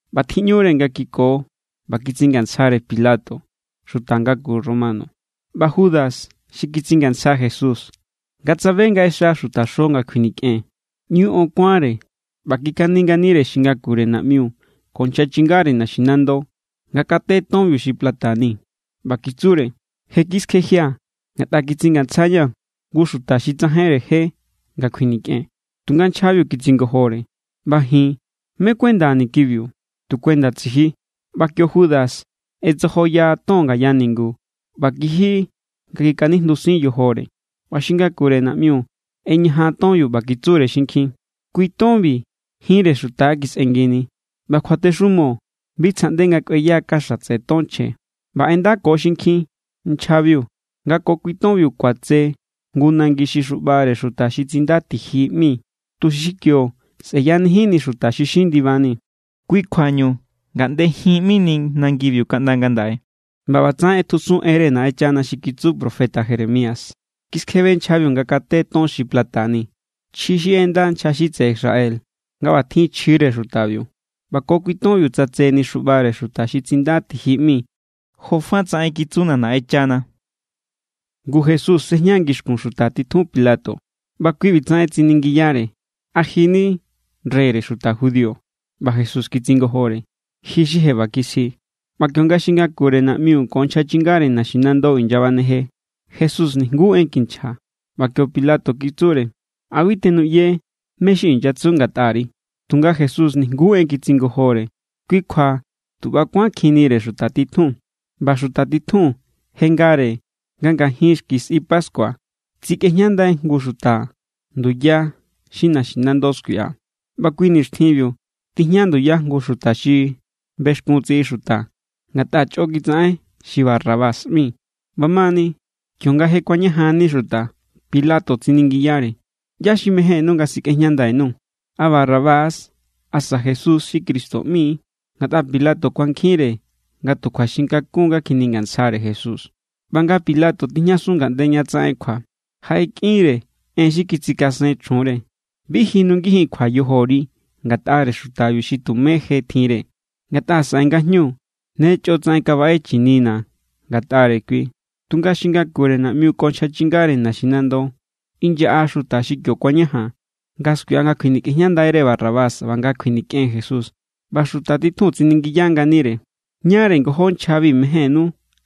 ꞌBa tjiꞌñure nga kiko ꞌba kitsingantsjare Pilato, xuta ngaku Romano. ꞌBa Judas, xi kitsingantsja Jesús, nga tsabe nga ꞌexa xutaxo nga kjuinikꞌen, ꞌñu on kuánre ꞌba kikani nganire xi ngakure naꞌmiu ko nchja chingare naxinando nga kate tonbiu xi plata ni. ꞌBa kitsure: —Je kiskjejia̱ ngatꞌa kitsingantsjaña̱ jngu xuta xi tsajainre je nga kjuinikꞌen. Tunga nchjabiu kitsingojore: —ꞌBa ji̱n, ¿mé= kuendani̱ kibiu? Tu kuenda tsiji. ꞌBa kio Judas ꞌetsojoya ton ngaya ningu ꞌba kiji nga kiskanijndusin yojore. ꞌBa xi ngakure naꞌmiu ꞌeñajan tonbiu, ꞌba kitsure xinkjin: —Kui tonbi jinre xuta= kisꞌengini, ꞌba kjuatexumo bi tsjaꞌnde nga kꞌueya kaxa tseꞌe ton chje. ꞌBa ꞌendako xinkjin nchjabiu nga ko kui tonbiu kuatse jngu nangi xi xuꞌbare xuta xi Tsinda Tiji ꞌmi, tuxi kio sꞌe̱yanijinni xuta xi xin ndibani. Kui kjuañu Ngaꞌnde Jin ꞌmini nangibiu kaꞌnda ngandaꞌe. ꞌBa ꞌbatsaꞌen ꞌetjusun enre Naꞌenchana xi kitsu profeta Jeremías: “Kiskjebe nchjabiu nga kate ton xi plata ni, chji xi ꞌenda nchja xi tseꞌe Israel nga ꞌba tjin chjire xutabiu. ꞌBa ko kui tonbiu tsatseni xuꞌbare xuta xi Tsinda Tiji ꞌmi, jofatsaꞌen kitsuna̱ Naꞌenchana.” Ngu Jesús sejña ngixkun xuta titjun Pilato, ꞌba kui ꞌbitsaꞌen tsiningiyare: —¿A ji= ni reyre xuta judío? ꞌBa Jesús kitsingojore: —Ji xi je ꞌba kisji. ꞌBa kionga xi ngakure naꞌmiu ko nchja chingare naxinando inyabaneje, Jesús nijnguú en kinchja. ꞌBa kio Pilato kitsure: —¿A bi tenuꞌye mé= xi inyatsu ngatꞌari? Tunga Jesús nijnguú en kitsingojore. Kui kjua tu ꞌba= kuánkjinnire xuta titjun. ꞌBa xuta titjun je ngare nga ngajin xki sꞌi pascua tsikꞌejñandai jngu xuta nduya xi naxinando skuiꞌa. ꞌBa kui nixtjinbiu tijña nduya jngu xuta xi bexkun tsiꞌi xuta ngatꞌa chꞌo kitsaꞌen, xi Barrabás ꞌmi. ꞌBamani, kionga je kuañajanni xuta, Pilato tsiningiyare: —¿ꞌYá= xi mejénnú nga sikꞌejñandai_nuu̱? ¿A Barrabás=, asa Jesús xi Cristo ꞌmi=? Ngatꞌa Pilato kuankjinre nga tu kjuaxinkakun= nga kjiningantsjare Jesús. ꞌBa nga Pilato tijñasun ngaꞌnde ña tsaꞌen kjua, jaꞌekꞌinre en xi kitsikasen chjunre: “Bi ji nungijin kjua yojori ngatꞌare xutabiu xi tumé je tjinre. Ngatꞌa saꞌe ngajñu ne chꞌotsaꞌen kabaꞌe chinina̱ ngatꞌare kui.” Tunga xi ngakure naꞌmiu ko nchja chingare naxinando, inyaꞌa xuta xi kio kuañajan, nga skuiꞌa nga kjuinikꞌejñandai=re Barrabás, ꞌba nga kjuinikꞌen Jesús. ꞌBa xuta titjun tsiningiya nganire: —¿Ñáre ngojó nchjabi mejénnú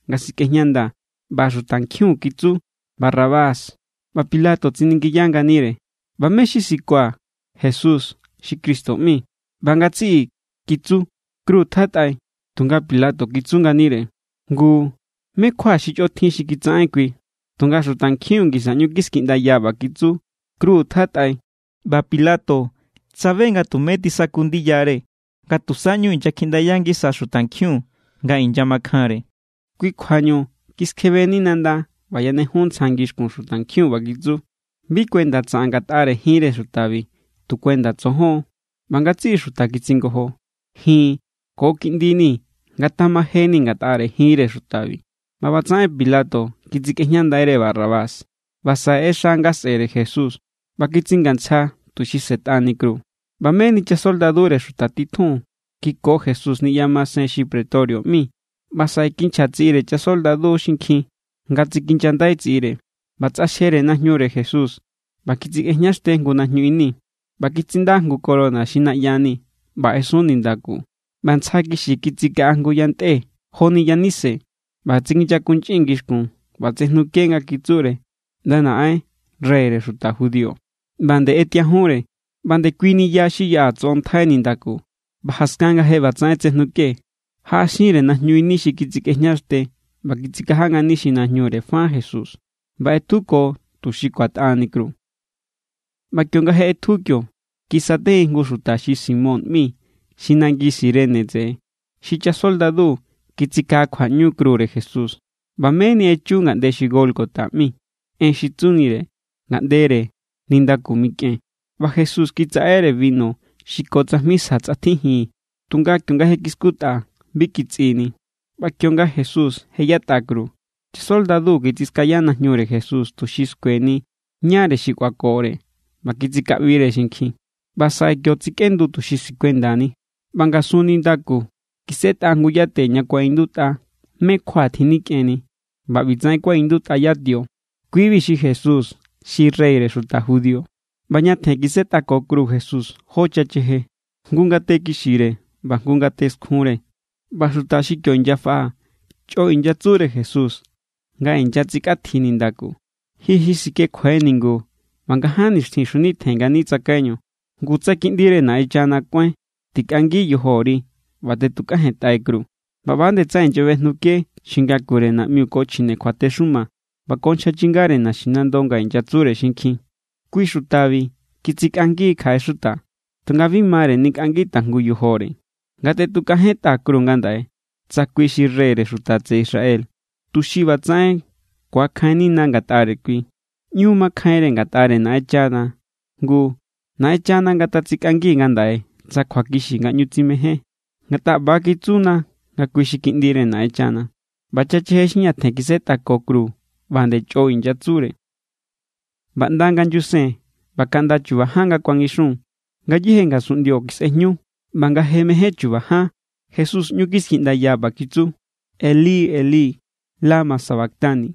nga sikꞌejñandaa̱? ꞌBa xutankjiun kitsu: —Barrabás. ꞌBa Pilato tsiningiya nganire: —¿ꞌBa mé= xi sikua̱ Jesús xi Cristo ꞌmi? ꞌBa ngatsiꞌi kitsu: —¡Kru tjatꞌai! Tunga Pilato kitsu nganire: —Ngu, ¿mé= kjua xi chꞌo tjin xi kitsaꞌen kui? Tunga xutankjiun ngisa ꞌñu kiskiꞌndaya ꞌba kitsu: —¡Kru tjatꞌai! ꞌBa Pilato tsabe nga tumé tisaku ndiyare, nga tusa ꞌñu inyakjiꞌndaya ngisa xutankjiun nga inyamakjanre. Kui kjuañu kiskjebeni nanda ꞌba yanejun ntsja ngixkun xutankjiun ꞌba kitsu: —Bi kuenda tsaꞌan ngatꞌare jinre xutabi, tu kuenda tsojon. ꞌBa ngatsiꞌi xuta kitsingojo: —Ji̱n ko kiꞌndini̱ ngatamajeni̱ ngatꞌare jinre xutabi. ꞌBa ꞌbatsaꞌen Pilato kitsikꞌejñandaire Barrabás, ꞌba saꞌe ꞌexa nga sꞌe̱re Jesús, ꞌba kitsingantsja tuxi sꞌe̱tꞌani kru. ꞌBa meni chasoldadure xuta titjun kiko Jesús niꞌya masen xi pretorio ꞌmi, ꞌba saꞌe kinchja tsiꞌire chasoldadu xinkjin nga tsikinyandai tsiꞌire. ꞌBa tsꞌaxjere najñure Jesús ꞌba kitsikꞌejñaxte jngu najñu ini. ꞌBa kitsinda jngu corona xi naꞌya ni ꞌba ꞌesun nindaku, ꞌba ntsja kixi kitsikaꞌa jngu yantꞌe joni yanise. ꞌBa tsinyakunchꞌin ngixkun ꞌba tsejnuke nga kitsure: —ꞌNda naꞌen, reyre xuta judío. ꞌBa nde ꞌetiajunre, ꞌba ndekuini ya xi yaꞌa tsoꞌontjai nindaku. ꞌBa jaskan nga je ꞌbatsaꞌen tsejnuke, jaꞌaxinre najñu ini xi kitsikꞌejñaxte, ꞌba kitsikaja ngani xi najñure fa Jesús. ꞌBa ꞌetjuko tuxi kuatꞌani kru. ꞌBa kionga je ꞌetju kio, kisatejin jngu xuta xi Simón ꞌmi xi nangi Cirene tseꞌe. Xi chasoldadu kitsikaꞌakjuaꞌñu krure Jesús. ꞌBa meni echu ngaꞌnde xi Gólgota ꞌmi. (En xi tsunire: ngaꞌndere nindaku mikꞌen.) ꞌBa Jesús kitsaꞌere binu xi ko tsajmi sja tsꞌatjijin, tunga kionga je kiskutꞌa, bi kitsꞌini. ꞌBa kionga Jesús je yatꞌa kru, chasoldadu kitsiskaya najñure Jesús tuxi skueni ñáre xi kꞌuakore ꞌba kitsikꞌabire xinkjin. ꞌBa saꞌe kio tsikꞌendu tuxi sikuendani. ꞌBa ngasun nindaku kisꞌetꞌa jngu yate ña kuaꞌindutꞌa mé= kjua tjinikꞌenni. ꞌBa ꞌbitsaꞌen kuaꞌindutꞌa yatio: “Kibi= xi Jesús xi reyre xuta judío.” ꞌBa ñatjen kisꞌetꞌako kru Jesús jó chacheje, jngu ngate kixire ꞌba jngu ngate skjunre. ꞌBa xuta xi kio inyafaꞌa chꞌo inyatsure Jesús nga inyatsikꞌatji nindaku: —Ji xi sikjekjuai ningu ꞌba nga ján nixtjin xjunitjen ngani tsakaiñu, ngu tsa Kiꞌndire Naꞌenchana kuáin, tikꞌangi yojori ꞌba tꞌetukajentꞌai kru. ꞌBa ꞌba=nde tsaꞌen inyabejnuke xi ngakure naꞌmiu ko chjine kjuatexuma ꞌba ko nchja chingare naxinando nga inyatsure xinkjin: —Kui xutabi kitsikꞌangi= kjaꞌe xuta, tunga bi mare nikꞌangi tajngu yojore. Ngatꞌetukajentꞌa kru ngandaꞌe tsa kui xi reyre xuta tseꞌe Israel, tuxi ꞌbatsaꞌen ku̱akjainnina ngatꞌare kui. ꞌÑu makjainre ngatꞌare Naꞌenchana, ngu ¡Naꞌenchana ngatatsikꞌangi ngandaꞌe tsa kjuakixi nga ꞌñu tsimején! Ngatꞌa ꞌba= kitsuna nga kui xi Kiꞌndire Naꞌenchana. ꞌBa chacheje xi ñatjen kisꞌetꞌako kru, ꞌba nde chꞌo inyatsure. ꞌBa ꞌnda nga nyusen ꞌba kaꞌnda chu̱ba̱ ján nga kuangixun, ngayéje ngasunꞌndio kisꞌejñu. ꞌBa nga je mején chu̱ba̱ ján Jesús ꞌñu kiskiꞌndaya, ꞌba kitsu: —Elí, Elí, ¿lama sabactani?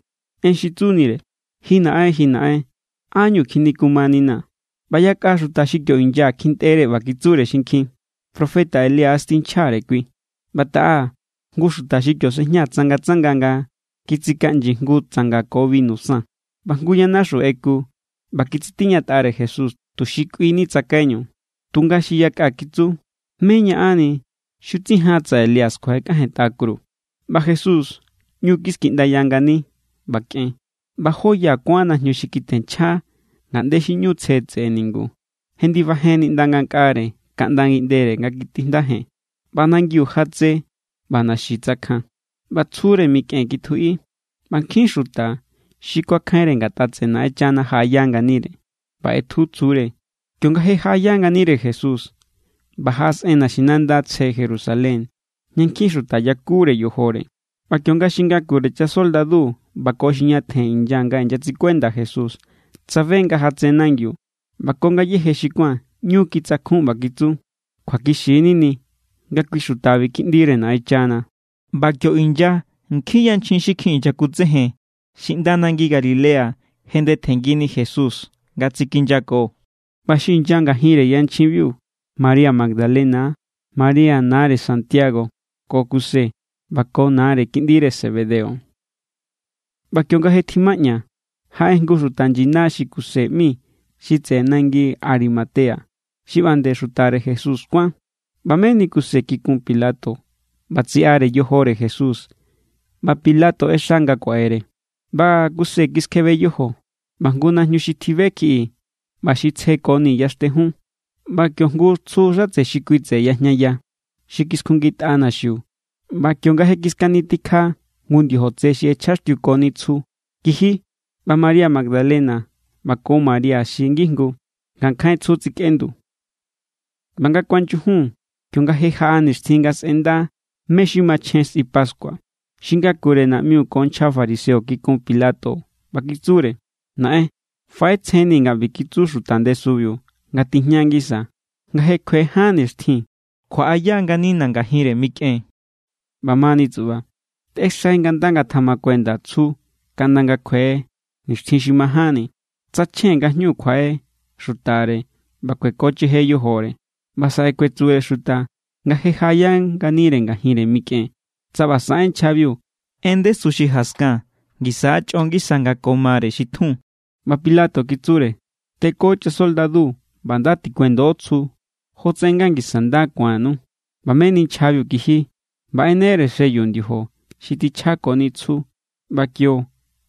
(En xi tsunire: Ji Naꞌen, ji Naꞌen, ¿ánñu kjinikumaninaa̱?) ꞌBa yakꞌa xuta xi kio inya kjintꞌere ꞌba kitsure xinkjin: —Profeta Elías tinchjare kui. ꞌBa taꞌa, jngu xuta xi kio sejña tsangatsanga nga kitsikaꞌnyi jngu tsanga ko binu san. ꞌBa jngu yanaxu ꞌeku ꞌba kitsitiñatꞌare Jesús tuxi kꞌuini tsakaiñu. Tunga xi yakꞌa kitsu: —¿Mé= ñaꞌanni? Xutsijan tsa Elías kjuaꞌekꞌajentꞌa kru. ꞌBa Jesús, ꞌñu kiskiꞌndaya ngani ꞌba kꞌen. ꞌBa jó ya kuán najñu xi kitjenchja ngaꞌnde xi ꞌñu tsje tseꞌe ningu, jendibajenni ꞌnda ngankꞌare kaꞌnda ngiꞌndere nga kitijndajen. ꞌBa nangiu jatse, ꞌba naxi tsakjan. ꞌBa tsjure mikꞌen kitjuꞌi, ꞌba nkjin xuta xi kuakjainre ngatꞌa tseꞌe Naꞌenchana jaꞌaya nganire. ꞌBa ꞌetju tsjure, kionga je jaꞌaya nganire Jesús, ꞌba jaꞌasꞌen naxinanda tsje Jerusalén ña nkjin xuta yakure yojore. ꞌBa kionga xi ngakure chasoldadu ꞌba ko xi ñatjen inya nga inyatsikuenda Jesús tsabe nga jatse nangiu ꞌba ko ngayéje xi kuán, ꞌñu kitsakjun ꞌba kitsu: —Kjuakixi=nini nga kui xutabi Kiꞌndire Naꞌenchana. ꞌBa kio inya nkjin yanchjin xi kjin inyakutsejen xi ꞌnda nangi Galilea jendetjengini Jesús nga tsikinyako. ꞌBa xi inya ngajinre yanchjinbiu María Magdalena, María nare Santiago ko Kuse, ꞌba ko nare kiꞌndire Zebedeo. ꞌBa kionga je tjimaꞌña, jaꞌe jngu xuta nyina xi Kuse ꞌmi xi tseꞌe nangi Arimatea. Xi ꞌba nde xutare Jesús kuán. ꞌBa meni Kuse kikun Pilato ꞌba tsiꞌare yojore Jesús. ꞌBa Pilato ꞌexa nga kuaꞌere. ꞌBa Kuse kiskjebe yojo, ꞌba jngu najñu xi tjibe kjiꞌi ꞌba xi tsjekoni yaxtejun. ꞌBa kio jngu tsju xatse xi kui tseꞌe yajñaya, xi kiskjuꞌngitꞌa naxiu. ꞌBa kionga je kiskanitikja jngu ndiojo tse xi ꞌechjaxtiukoni tsju, kiji. ꞌBa María Magdalena ꞌba ko María xi ngijngu ngankjain tsju tsikꞌendu. ꞌBa nga kuanyujun, kionga je jaꞌa nixtjin nga sꞌenda mé= xi machjen sꞌi pascua, xi ngakure naꞌmiu ko nchja fariseo kikun Pilato, ꞌba kitsure: —Naꞌen, faꞌetsjenni̱ nga ꞌbi kitsu xuta ndesubiu nga tijña ngisa: “Nga je kjue ján nixtjin, kjuaꞌaya nganina̱ ngajinre mikꞌen.” ꞌBamani tsuꞌba, tꞌexai nga nda ngatamakuenda tsju kaꞌnda nga kjue nixtjin xi majánni. Tsa chjen ngajñu kjuaꞌe xutare ꞌba kuekocheje yojore, ꞌba saꞌe kuetsure xuta nga je jaꞌaya nganire ngajinre mikꞌen. Tsa ꞌba saꞌen nchjabiu, en ndesu xi jaskan ngisa= chꞌo ngisa nga ko mare xi tjun. ꞌBa Pilato kitsure: —Teko chasoldadu ꞌba nda tikuendo tsju jotsaꞌen nga ngisa nda ku̱annu. ꞌBa meni nchjabiu kiji ꞌba ꞌenere sello ndiojo xi tjichjakoni tsju ꞌba kio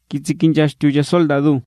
kitsikinyaxtiu chasoldadu.